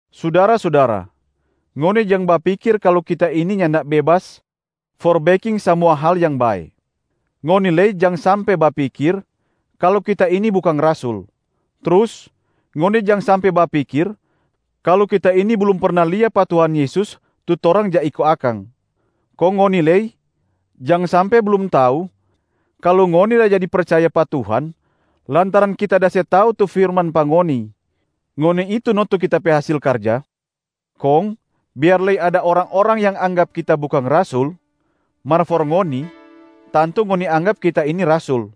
Sudara-sudara, ngoni jang bapikir kalu kita ini nyanda bebas for beking samua hal yang bae. Ngoni lei jang sampe bapikir kalu kita ini bukang rasul. Trus ngoni jang sampe bapikir kalu kita ini blum perna lia pa Tuhan Yesus tu torang ja iko akang. Kong ngoni lei jang sampe blum tau kalu ngoni da jadi percaya pa Tuhan lantaran kita da se tau tu firman pa ngoni, ngoni itu no tu kita pe hasil karja. Kong biar lei ada orang-orang yang anggap kita bukang rasul, mar for ngoni, tantu ngoni anggap kita ini rasul.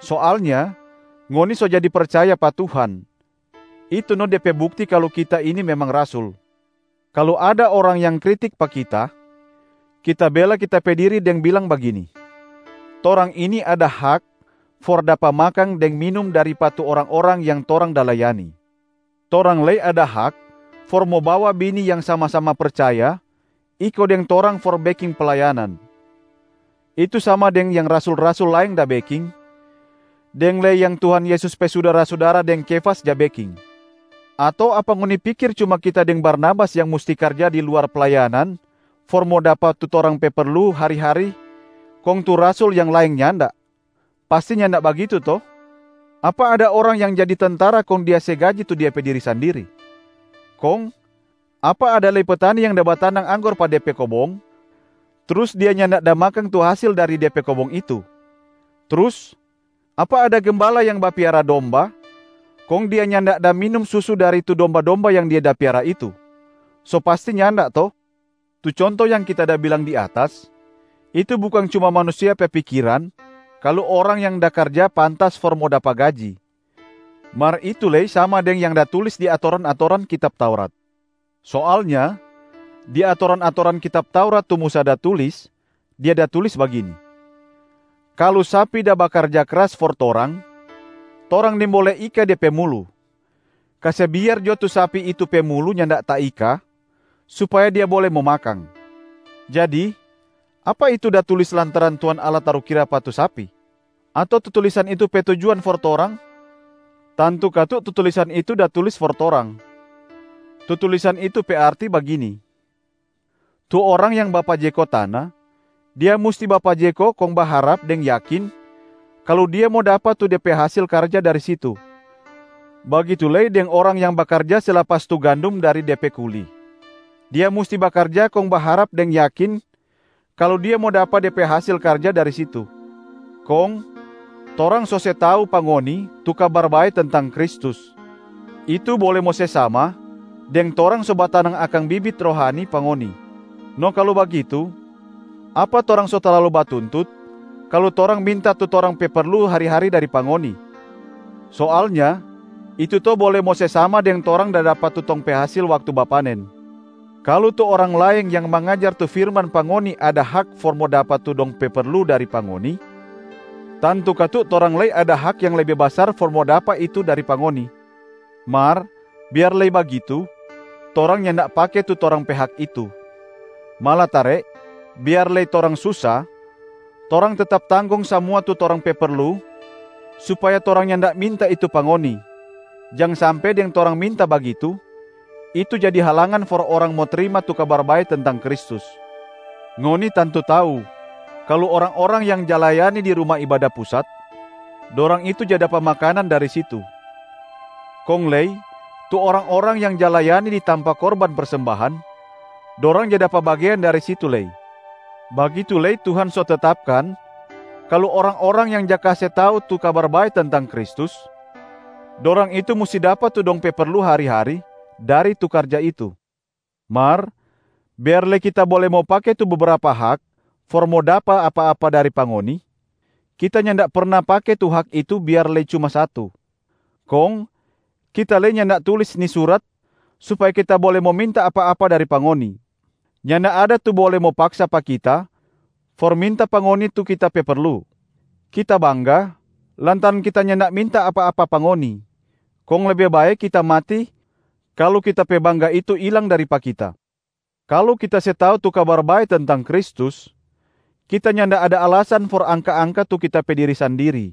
Soalnya ngoni so jadi percaya pa Tuhan, itu no de pe bukti kalu kita ini memang rasul. Kalu ada orang yang kritik pa kita, kita bela kita pe diri deng bilang bagini: torang ini ada hak for dapa makang deng minum dari pa tu orang-orang yang torang da layani. Torang lei ada hak for mo bawa bini yang sama-sama percaya iko deng torang for beking playanan, itu sama deng yang rasul-rasul laeng da beking, deng lei yang Tuhan Yesus pe sudara-sudara deng Kefas ja beking. Ato apa ngoni pikir cuma kita deng Barnabas yang musti karja di luar playanan for mo dapa tu torang pe perlu hari-hari kong tu rasul yang laeng nyanda? Pasti nyanda bagitu to? Apa ada orang yang jadi tentara kong dia se gaji tu dia pe diri sandiri? Kong apa ada lei petani yang da batanang anggor pa de pe kobong trus dia nyanda da makang tu hasil dari de pe kobong itu? Trus apa ada gembala yang da bapiara domba, kong dia nyanda da minum susu dari tu domba-domba yang dia da piara itu? So pasti nyanda to? Tu conto yang kita da bilang di atas, itu bukang cuma manusia pe pikiran kalu orang yang da karja pantas for mo dapa gaji, mar itu lei sama deng yang da tulis di atoran-atoran kitab Taurat. Soalnya di atoran-atoran kitab Taurat tu Musa da tulis, dia da tulis bagini, “Kalu sapi da bakarja krasa for torang, torang nimbole ika de pe mulu. Kase biar jo tu sapi itu pe mulu nyanda taika, supaya dia bole mo makang.” Jadi apa itu da tulis lantaran Tuhan Allah tarukira pa tu sapi? Ato tu tulisan itu pe tujuan for torang? Tantu katu tu tulisan itu da tulis for torang. Tu tulisan itu pe arti bagini: tu orang yang bapajeko tana, dia musti bapajeko kong baharap deng yakin kalu dia mo dapa tu de pe hasil karja dari situ. Bagitu lei deng orang yang bakarja se lapas tu gandum dari de pe kuli, dia musti bakarja kong baharap deng yakin kalu dia mo dapa de pe hasil karja dari situ. Kong torang so se tau pa ngoni tu Kabar Bae tentang Kristus, itu bole mo se sama deng torang so batanang akang bibit rohani pa ngoni. No kalu bagitu, apa torang so talalu batuntut kalu torang minta tu torang pe perlu hari-hari dari pa ngoni? Soalnya itu to bole mo se sama deng torang da dapa tu tong pe hasil waktu bapanen. Kalu tu orang laeng yang mangajar tu firman pa ngoni ada hak for mo dapa tu dong pe perlu dari pa ngoni, tantu katu torang lei ada hak yang lebe basar for mo dapa itu dari pa ngoni! Mar biar lei bagitu, torang nyanda pake tu torang pe hak itu. Malatare biar lei torang susa, torang tetap tanggong samua tu torang pe perlu supaya torang nyanda minta itu pa ngoni, jang sampe deng torang minta bagitu, itu jadi halangan for orang mo trima tu Kabar Bae tentang Kristus. Ngoni tantu tau kalu orang-orang yang ja layani di Ruma Ibada Pusat, dorang itu ja dapa makanan dari situ. Kong lei tu orang-orang yang ja layani di tampa korban persembahan, dorang ja dapa bagean dari situ lei. Bagitu lei Tuhan so tetapkan kalu orang-orang yang ja kase tau tu Kabar Bae tentang Kristus, dorang itu musti dapa tu dong pe perlu hari-hari dari tu karja itu. Mar biar lei kita bole mo pake tu bebrapa hak for mo dapa apa-apa dari pa ngoni, kita nyanda perna pake tu hak itu biar lei cuma satu. Kong kita lei nyanda tulis ni surat supaya kita bole mo minta apa-apa dari pa ngoni. Nyanda ada tu bole mo paksa pa kita for minta pa ngoni tu kita pe perlu! Kita bangga lantaran kita nyanda minta apa-apa pa ngoni, kong lebe bae kita mati kalu kita pe bangga itu ilang dari pa kita. Kalu kita se tau tu Kabar Bae tentang Kristus, kita nyanda ada alasan for angka-angka tu kita pe diri sandiri,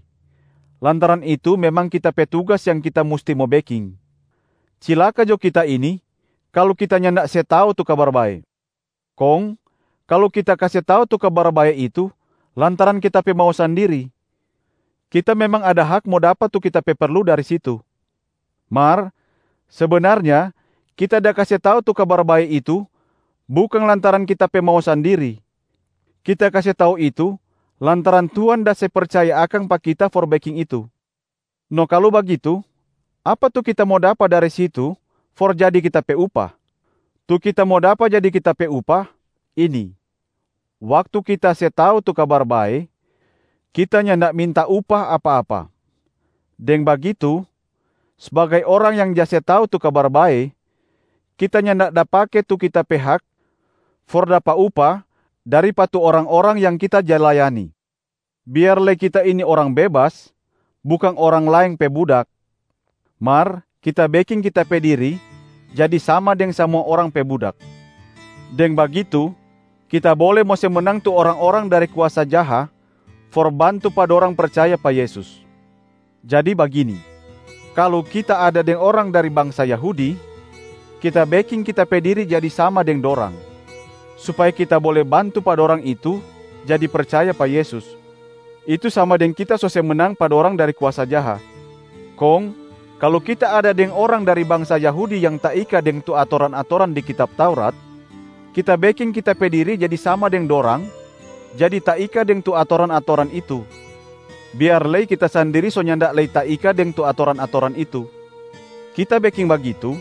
lantaran itu memang kita pe tugas yang kita musti mo beking. Cilaka jo kita ini kalu kita nyanda se tau tu Kabar Bae. Kong kalu kita kase tau tu Kabar Bae itu lantaran kita pe mau sandiri, kita memang ada hak mo dapa tu kita pe perlu dari situ. Mar sebenarnya kita da kase tau tu Kabar Bae itu bukang lantaran kita pe mau sandiri, kita kase tau itu lantaran Tuhan da se percaya akang pa kita for beking itu. No kalu bagitu, apa tu kita mo dapa dari situ for jadi kita pe upah? Tu kita mo dapa jadi kita pe upah ini: waktu kita se tau tu Kabar Bae, kita nyanda minta upah apa-apa. Deng bagitu, sbagai orang yang ja se tau tu Kabar Bae, kita nyanda da pake tu kita pe hak for dapa upah dari pa tu orang-orang yang kita ja layani. Biar lei kita ini orang bebas, bukang orang laeng pe budak, mar kita beking kita pe diri jadi sama deng samua orang pe budak. Deng bagitu kita bole mo se menang tu orang-orang dari kuasa jaha for bantu pa dorang percaya pa Yesus. Jadi bagini: kalu kita ada deng orang dari bangsa Yahudi, kita beking kita pe diri jadi sama deng dorang, supaya kita bole bantu pa dorang itu jadi percaya pa Yesus, itu sama deng kita so se menang pa dorang dari kuasa jaha. Kong kalu kita ada deng orang dari bangsa Yahudi yang taika deng tu atoran-atoran di kitab Taurat, kita beking kita pe diri jadi sama deng dorang jadi taika deng tu atoran-atoran itu, biar lei kita sandiri so nyanda lei taika deng tu atoran-atoran itu. Kita beking bagitu,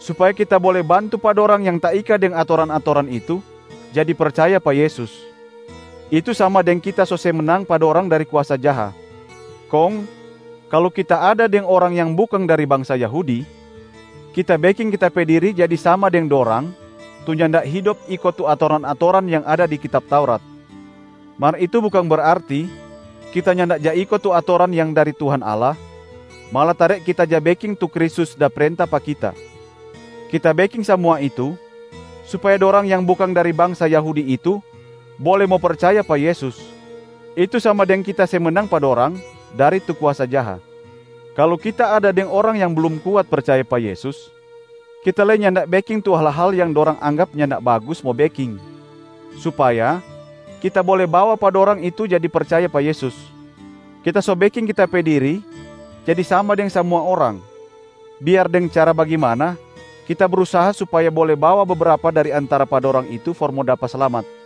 supaya kita bole bantu pa dorang yang taika deng tu atoran-atoran itu jadi percaya pa Yesus, itu sama deng kita so se menang pa dorang dari kuasa jaha. Kong kalu kita ada deng orang yang bukang dari bangsa Yahudi, kita beking kita pe diri jadi sama deng dorang tu nyanda hidop iko tu atoran-atoran yang ada di kitab Taurat. Mar itu bukang berarti kita nyanda ja iko tu atoran yang dari Tuhan Allah, malatare kita ja beking tu Kristus da prenta pa kita. Kita beking samua itu, supaya dorang yang bukang dari bangsa Yahudi itu bole mo percaya pa Yesus, itu sama deng kita se menang pa dorang dari tu kuasa jaha. Kalu kita ada deng orang yang blum kuat percaya pa Yesus, kita lei nyanda beking tu hal-hal yang dorang anggap nyanda bagus mo beking, supaya kita bole bawa pa dorang itu jadi percaya pa Yesus. Kita so beking kita pe diri jadi sama deng samua orang, biar deng cara bagimana kita brusaha supaya bole bawa bebrapa dari antara pa dorang itu for mo dapa slamat.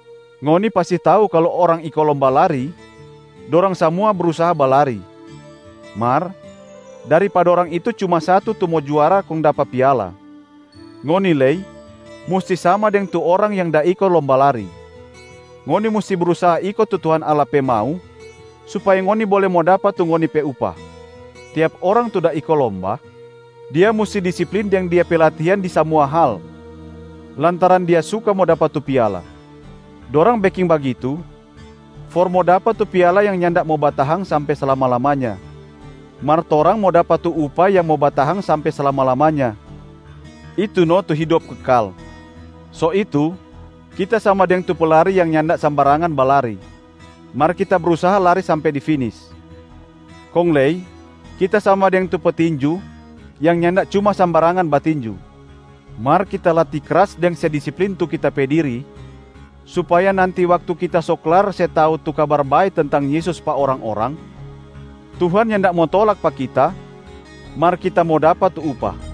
Ngoni pasti tau kalu orang iko lomba lari, dorang samua brusaha balari, mar dari pa dorang itu cuma satu tu mo juara kong dapa piala. Ngoni lei musti sama deng tu orang yang da iko lomba lari: ngoni musti brusaha iko tu Tuhan Allah pe mau supaya ngoni bole mo dapa tu ngoni pe upah. Tiap orang tu da iko lomba, dia musti disiplin deng dia pe latihan di samua hal lantaran dia suka mo dapa tu piala. Dorang beking bagitu for mo dapa tu piala yang nyanda mo batahang sampe slama-lamanya, mar torang mo dapa tu upah yang mo batahang sampe slama-lamanya, itu no tu hidop kekal. So itu kita sama deng tu pelari yang nyanda sambarangan balari, mar kita brusaha lari sampe di finis. Kong lei kita sama deng tu petinju yang nyanda cuma sambarangan batinju. Mar kita latih kras deng se disiplin tu kita pe diri supaya nanti waktu kita so klar se tau tu Kabar Bae tentang Yesus pa orang-orang, Tuhan nyanda mo tolak pa kita mar kita mo dapa tu upah.